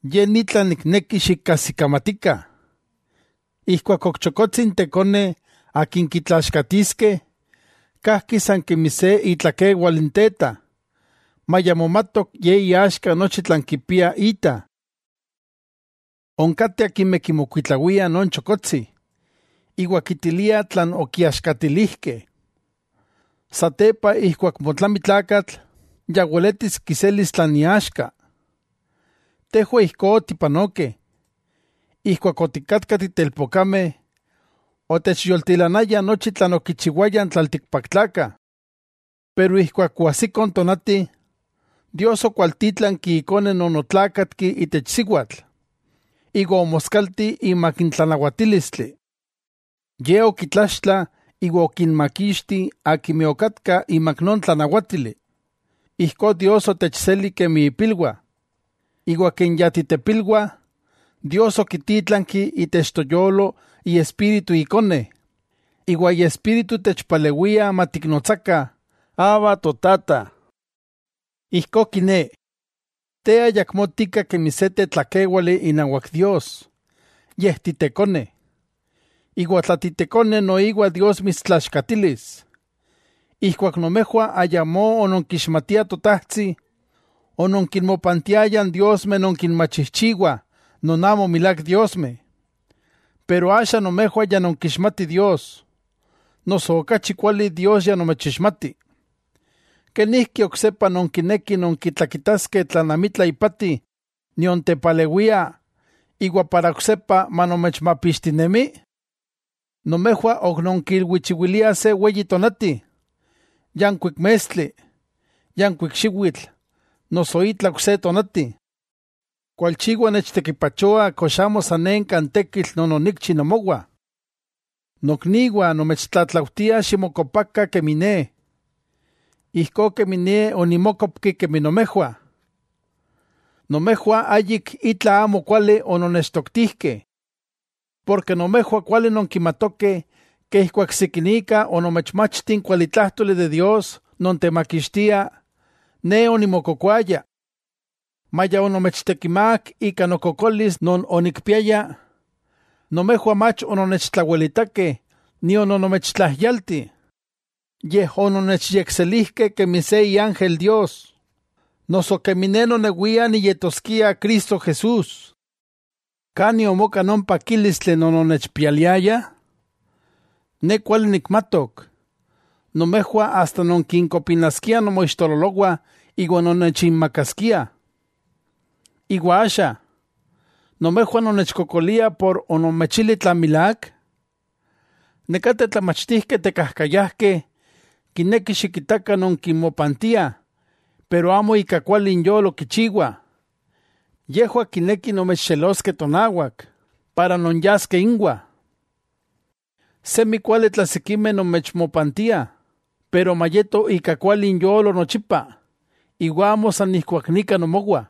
Ye ni tlan nikneki xikajsikamatikah: Ijkuak ok chokotsi n tekone akin kitlaaxkatiskeh, kajki san kemi se itlakewal n teta, maya momatok ye iaxka nochi tlan kipia ita. Onkateh akimeh kimokuitlawiah non chokotsi iwa kitiliah tlan okiaxkatilijkeh. Satepa ijkuak motlami tlakatl, ya weletis kiselis tlan iaxka. Tejwah ijkó otipanokeh, ijkuak otikatkah titelpokameh otechyoltilanaya nochi tlan okichiwayah n tlaltikpaktlakah. Pero ijkuak oajsiko n tonati, Dios okwaltítlanki Ikone non otlákatki itech siwatl, iwa omoskalti imak n tlanawatílistli. Ye okitlaxtla iwa okinmakixti akimeh okatkah imak non tlanawátili, ijkó Dios otechseli kemi ipilwah. Iwa ken ya titepilwah, Dios okitítlanki itech toyolo Iespíritu Ikone, iwa Iespíritu techpalewia matiknotsakah: “¡Abba, Totata!” Ijkó kiné, te ayakmó tika kemi se tetlakéwali inawak Dios, yej titekone. Iwa tla titekone noiwa Dios mitstlaaxkatilis. Ijkuak nomejwah ayamó ononkixmatiah Totajtsi, ononkinmopantiayah n diosmeh non kinmachijchiwah non amo milák diosmeh. Pero axa nomejwah ya nonkixmatih Dios, noso okachi kuali Dios ya nomechixmati. ¿Kenijki oksepa nonkinekih nonkitlakitaskeh tlan amitla ipati nion tepalewia, iwa oksepa manomechmapixtinemi? Nomejwah ok non kilwichiwiliah se tonati, yankuik mestli, yankuik xiwitl noso itla ok se tonati. Kualchiwa nechtekipachoa kox amo sanenka n tekitl non onikchi nomowah. Nokniwah nomechtlatlaujtia ximokopakah kemi ne, ijkó kemi ne onimokopki kemi nomejwah. Nomejwah ayik itla amokuali ononnechtoktijkeh. Nomejwah kuali nonkimatokeh ijkuak sikinika onomechmachti n kualitlájtoli de Dios non techmakixtia, ne onimokokoaya. Maya onomechtekimák ika nokokolis non onikpiaya, nomejwah mach ononnechtlawelitakeh nion onomechtlajyalti. Yej ononnechyekselijkeh kemi se iángel Dios; noso kemi ne nonewia niyetoskia Cristo Jesús. ¿Kani omoka non pakílistli non ononnechpialiayah? Ne kuali nikmatok, nomejwah asta nonkinkopinaskiah nomoixtololowah iwa nonnechinmakaskiah. Iwa axa, ¿nomejwah nonnechkokoliah por onomechili tlan milák? Nekateh tlamachtijkeh tekajkayajkeh kinekih xikitakah nonkinmopantiah, pero amo ika kuali inyolo kichiwah. Yejwah kinekih nomechxeloskeh tonawak, para nonyaskeh inwah. Semi kuali tla sikimeh nomechmopantiah, pero mayeto ika kuali inyolo nochipa, iwa amo san ijkuak nika nomowah.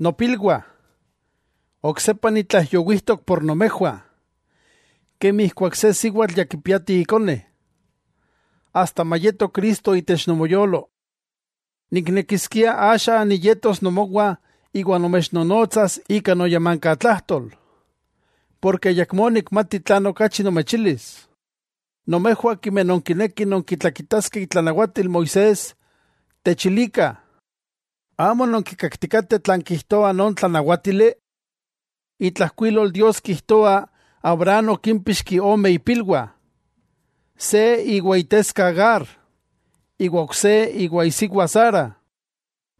Nopilwah, oksepa nitlaijyowijtok por nomejwah, kemi ijkuak se siwatl ya kipiati ikone, asta mayeto Cristo itech nomoyolo. ¡Niknekiskia axa niyetos nomowah iwa nomechnonotsas ika noyamankatlajtol, porke ayakmó nikmati tlan okachi nomechilis! Nomejwah akimeh nonkinekih nonkitlakitaskeh itlanawatil Moisés, techilikah: ¿amo nonkikaktikateh tlan kijtoa non tlanawátili? Itlajkuilol Dios kijtoa Abraham okímpixki ome ipilwah: se iwan iteska Agar, iwa ok se iwa isiwa Sara.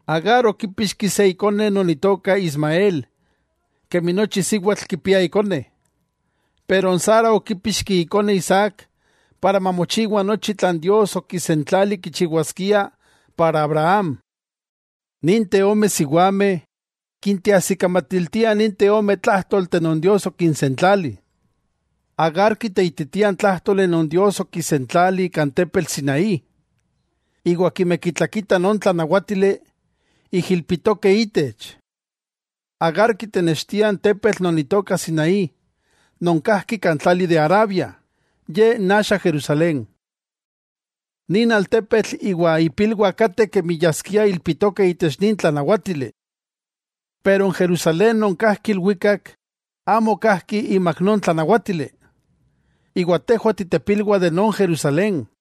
Agar okípixki se ikone non itoka Ismael kemi nochi siwatl kipia ikone, pero n Sara okípixki ikone Isaac para mamochiwa nochi tlan Dios okisentlali kichiwaskia para Abraham. Ninteh ome siwameh kinteajsikamatiltiah ninteh ome tlájtolteh non Dios okinsentlali. Agar kiteititia n tlájtoli non Dios okisentlali kan tepetl Sinaí, iwa akimeh kitlakitah non tlanawátili, ijilpitokeh itech. ¡Agar kitenextia n tepetl non itoka Sinaí non kajki kan tlali de Arabia!, ye n axa Jerusalén. Nin altepetl iwa ipilwah kateh kemi yaskia ilpitokeh itech nin tlanawátili. Pero n Jerusalén non kajki ilwikak amo kajki imak non tlanawátili, iwa tejwah titepilwah de non Jerusalén.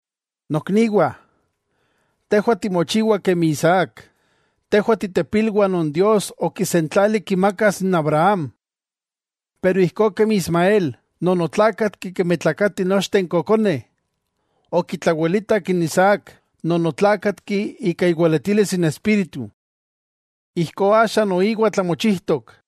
Nokniwah, tejwah timochiwah kemi Isaac, tejwah titepilwah non Dios okisentlali kimakas n Abraham. Pero ijkó kemi Ismael, non otlákatki kemi tlakatih nochteh n kokoneh, okitlawelitak n Isaac, non otlákatki ika iweletilis Espíritu. Ijkó axa noiwa tlamochijtok.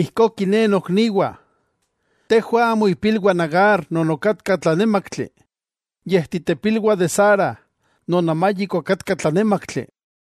Ijkó kiné nokniwah, tejwah amo ipilwah Agar non okatka tlanémaktli, yej titepilwah de Sara non amayik okatka tlanémaktli.